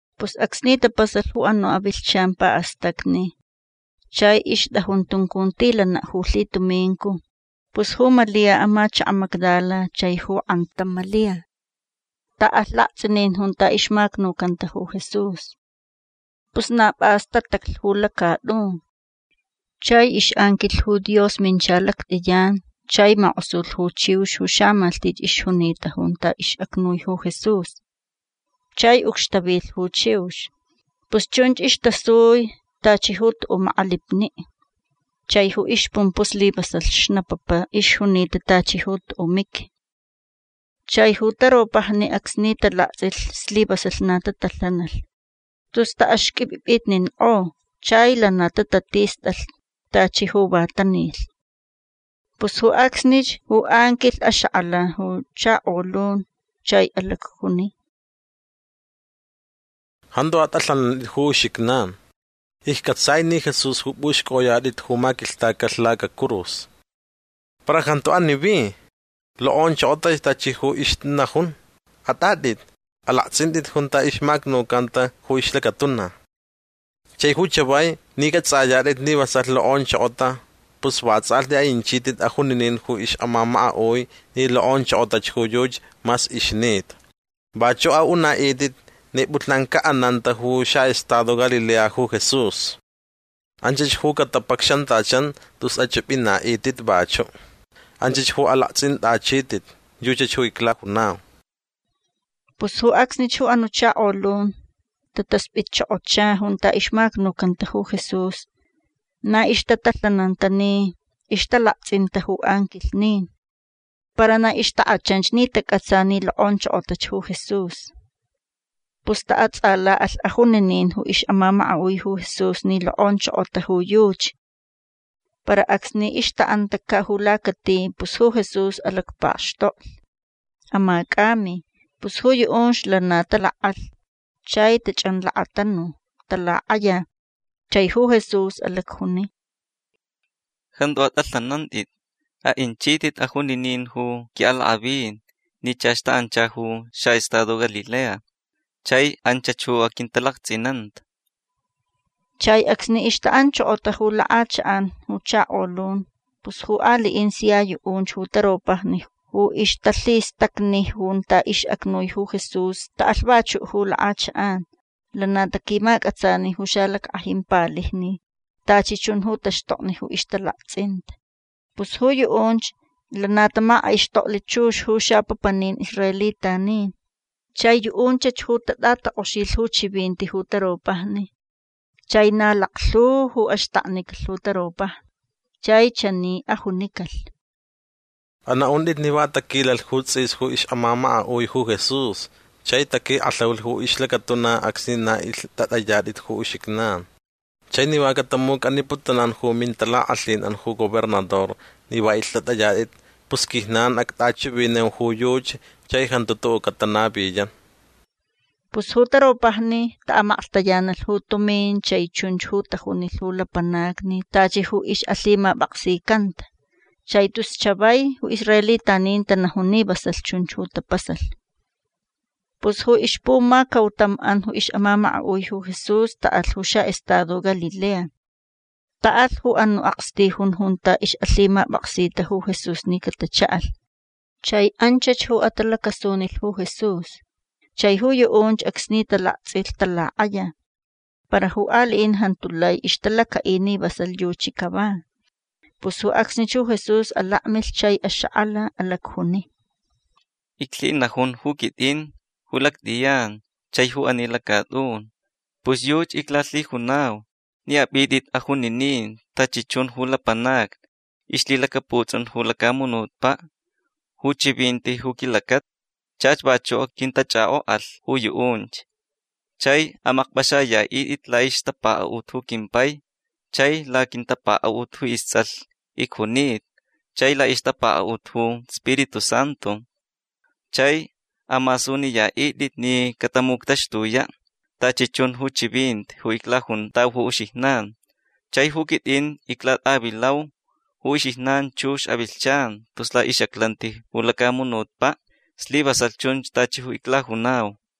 Pus acsni tapasalh ju anu' avilhchan pa'astacni chai ixt'ajun tuncuntilana' ju lhitumincu pus ju Malia amachaka' Magdala chai ju k'antam Malia ta'alh lakts'inin junta ixmacnucanta ju Jesús. Pus na p'as tataclh ju lacat'un. Chai ix'anquilh ju Dios mincha lact'iyan chai mak'osulh ju chiux ju xamalhtich ixjunita junta ix'acnui ju Jesús. Chai ucxtavilh ju chiux. Pus chunch istasui tachi ju tu'u' mak'alipni'. Chai ju ixpumpu' slivasalh xnapapa ixjunita tachi ju tu'u' miqui. Chai ju taropajni acsni talakts'ilh slivasalh na tatalhanalh tus ta'axq'uip'ip'itnik'o. Chai lana tatatist'alh tachi ju va tanilh. Pus ju acsnich ju anquilh axak'ala ju chakolun chai alacjuni: ―Jantu at'alhanant'it ju uxijnan. Icc'atsai ni Jesús ju p'uxc'oyat'it ju maquilhtacalh lacacurus. Para jantu ani vi. Lok'onchokotach tachi ju ixnajun. At'at'it. Alakts'int'it junta ixmacnucanta ju ixlacatuna. Chai ju chavai ni c'ats'ayat'it ni vasalh lok'onchokota pus vats'alhti a'inchit'it ajuninin ju ix'amamaka'ui ni lok'onchokotach ju yuchi mas ixnita. Vachu' a'una'it'it ni p'ulhnan ca'ananta ju xa'estado Galilea ju Jesús. Anchach ju catapacxantachan tus ach'ip'ina'it'it vachu'. Anchach ju alakts'int'achit'it. Yuchach ju iclajunau. Pus ju acsnich ju anu' chakolun tatasp'itchokocha junta ixmacnucanta ju Jesús. Na ixtatalhananta ni ixtalakts'inta ju anquilhnin. Para na ixtak'achanch ni tac'atsa ni lok'onchokotach ju Jesús. Pus ta'ats'ala'alh ajuninin ix'amamaka'ui ju Jesús ni lok'onchokota ju yuchi. Para acsni ixta'antaca' ju lacati pus ju Jesús alacpakxtoklh. Amac'ami. Pus ju yu'unch lana talak'alh chai tach'anlakatanu. Talak'aya. Chai ju Jesús alacjuni: ―Jantu at'alhanant'it. A'inchit'it ajuninin ju qui'alak'avin ni chach ta'ancha ju xa'estado Galilea chai anchach ju aquintalakts'inanta. Chai acsni ixta'anchokota ju lak'achak'an ju chakolun pus ju ali'in sia yu'unch ju taropajni ju ixtalhistacni junta ix'acnui ju Jesús ta'alh vachu' ju lak'achak'an. Lana taquimac'atsani ju xalack'ajin palijni tachi chun ju taxtokni ju ixtalakts'inta. Pus ju yu'unch lana tamak'aixtokli chux ju xapapanin israelitanin. Chai yu'unchach ju tat'atak'oxilh ju chivinti ju taropajni. Chai na laklhu ju axtaknicalh ju taropajni. Chai chani ajunicalh: ―Ana'unt'it ni va taquilalh ju ts'is ju ix'amamaka'ui ju Jesús chai taquik'alhaulh ju ixlacatuna acsni na ilht'at'ayat'it ju uxijnan. Chai ni va catamuc'aniputunan ju mintalak'alhin'an ju gobernador ni va ilht'at'ayat'it pus ju quijnan act'achivinau ju yuchi chai jantu tu'u' catanaviyan. Pus ju taropajni ta'amaklhtayanalh ju tumin chai chunch ju tajunilh ju lapanacni tachi ju ix'alhimap'aksicanta. Chai tus chavai ju israelitanin tanajun ni vasalh chunch ju tapasalh. Pus ju ixpumacautam'an ix'amamaka'ui ju Jesús ta'alh ju xa'estado Galilea. Ta'alh ju anu' akstijun junta ix'alhimap'aksita ju Jesús ni catacha'alh. Chai anchach ju atalac'asunilh ju Jesús. Chai ju yu'unch acsni talakts'ilh talak'aya. Para ju ali'in jantu lai ixtalaca'i ni vasalh yuchi cava. Pus ju acsnich ju Jesús alakmilh chai axak'ala. Alacjuni: ―Iclhinajun ju quit'in ju lact'iyan chai ju ani lacat'un. Pus yuchi iclalhijunau ni ap'it'it ajuninin tachi chun ju lapanacni ixlhilacaputs'un ju lacamunutpa' ju chivinti ju quilacata. Chach vachu' quintach'ak'ok'alh ju yu'unch. Chai amakp'axaya'it'it la'ixtapaka'ut ju quimpai chai laquintapaka'ut ju ists'alh icjunita chai la'ixtapaka'ut ju Spiritu Santu. Chai amasuniya'it'it ni catamuctaxtuya' tachi chun ju chivinti ju iclajuntau ju uxijnan. Chai ju quit'in iclat'avilau ju uxijnan chux avilhchan tus la'ix'aclanti ju lacamunutpa'. Slivasalh chun tachi ju iclajunau.